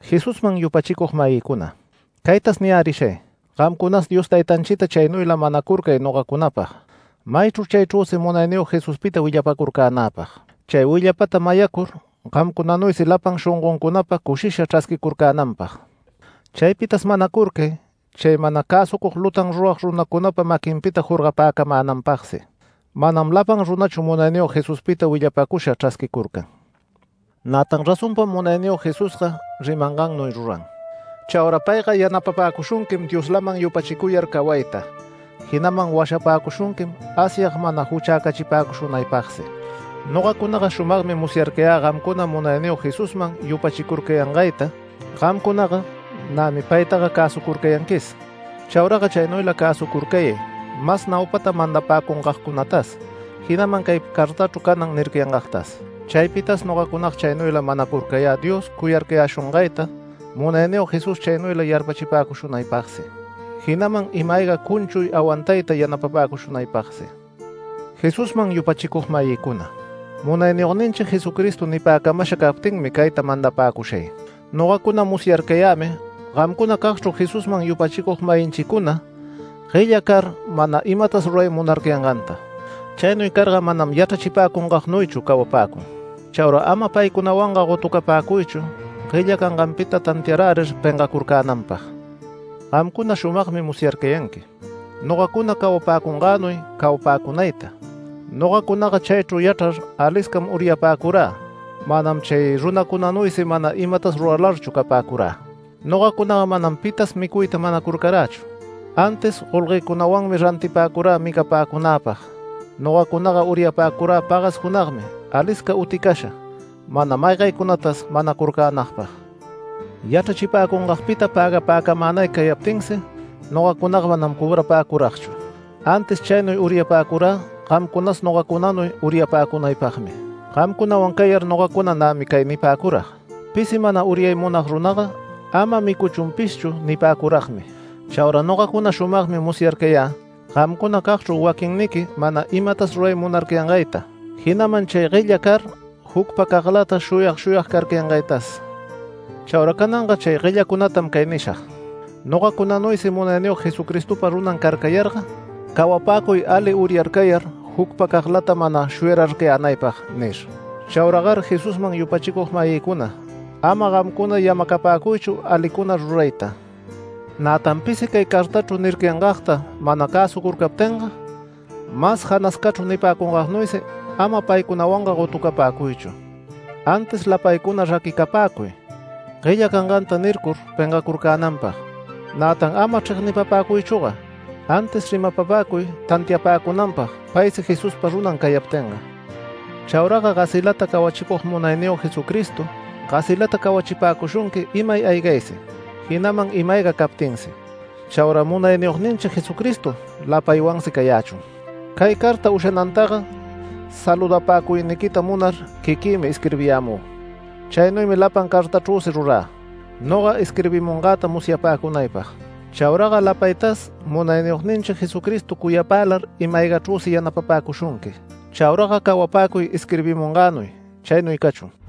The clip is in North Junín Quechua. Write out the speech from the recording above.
Jesusman yupachicug-mayïcuna, caytas niyärishay: Gamcunas Dios Taytanchita chaynuyla manacurcay nogacunapag, maychru chaychrüsi Munayniyog Jesuspita willapacurcänäpag. Chay willapata mayarcur gamcunanuysi lapan shongoncunapa cushisha chrasquicurcänanpag. Chaypitas manacurcay chay mana cäsucug lutan rurag runacunapa maquinpita jorgapäcamänanpagsi. Manam lapan runachu Munayniyog Jesuspita willapacusha chrasquicurcan. Nätan razonpam Munayniyog Jesusga rimangannuy ruran. Chaura payga yanapapäcushunquim Dioslaman yupachicuyar cawayta, jinaman washapäcushunquim Asyag mana juchacächipäcushunaypagsi. Nogacunaga shumagmi musyarcayä gamcuna Munayniyog Jesusman yupachicurcayangayta. Gamcunaga nämi paytaga cäsurcucayanquis. Chauraga chaynuyla cäsucurcayay mas naupata mandapäcungagcunatas, jinaman cay cartachru canan nircayangagtas. Chaypitas nogacunaga chaynuylam manacurcayä Dios cuyarcayäshungayta Munayniyog Jesús chaynuyla yarpachipapäcushunaypagsi, jinaman ima-ayga cunchuy awantayta yanapapäcushunaypagsi. Jesusman yupachicug-mayïcuna, Munayniyogninchi Jesucristo nipäcamasha captinmi cayta mandapäcushay: Nogacuna musyarcayämi gamcunacagchru Jesusman yupachicug-mayinchicuna guella car mana imatas ruray munarcayanganta. Chaynuy carga manam yachrachipäcungagnuychu cawapäcun. Chaura ama paycunawanga gotucapäcuychu guella canganpita tantiarärir pengacurcänanpag. Gamcuna shumagmi musyarcayanqui, nogacuna cawapäcungänuy cawapäcunayta. Nogacunaga chaychru yachrar aliscam uryapäcurä manam chay runacunanuysi mana imatas ruralarchu capäcura. Nogacunaga manam pitas micuyta manacurcarächu antis golguëcunawanmi rantipäcurä micapäcunäpag. Nogacunaga uryapäcurä pagas junagmi alisca uticasha, mana maygaycunatas manacurcänagpag. Yachrachipäcungagpita pägapäcamänay cayaptinsi nogacunaga manam cobrapäcuragchu, antis chaynuy uryapäcurä gamcunas nogacunanuy uryapäcunapagmi. Gamcunawan cayar nogacunaga nämi cay nipäcurag: “Pisi mana uryay munag runaga, ama micuchunpishchu” nipäcuragmi. Chaura nogacuna shumagmi musyarcayä gamcunacagchru waquinniqui mana imatas ruray munarcayangayta, jinaman chay guella car jucpacaglata shuyag shuyag carcayangaytas. Chaura cananga chay guellacunatam cay nishag: “Nogacunanuysi Munayniyog Jesucristopa runan cayarcayarga cawapäcuy ali uryarcayar jucpacaglata, mana shuyararcayänaypag” nir. Chauragar Jesusman yupachicug-mayïcuna, ama gamcuna yamacapäcuychu alicuna rurayta. Nätan pisi cay cartachru nircayangagta mana cäsucurcaptinga, mas janascachru nipäcungagnuysi ama paycunawanga gotupäcuychu, antis lapaycuna raquicapäcuy guella canganta nircur pengacurcänanpag. Nätan ama chregnipapäcuychüga, antis rimapapäcuy tantiapäcunanpag paysi Jesuspa runan cayaptinga. Chauraga gasilata cawachicug Munayniyog Jesucristo gasilata cawachipäcushunqui imay aygaysi, jinaman ima-ayga captinsi. Chaura Munayniyogninchi Jesucristo lapaywansi cayächun. Cay carta ushanantaga saludapäcuyniquita munar quiquïmi isquirbirayämü. Chaynuymi lapan cartachrüsi rurä, noga isquirbimungäta musyapäcunaypag. Chauraga lapaytas Munayniyogninchi Jesucristo cuyapälar ima-aygachrüsi yanapapäcushunqui. Chauraga cawapäcuy isquirbimungänuy. Chaynuy cachun.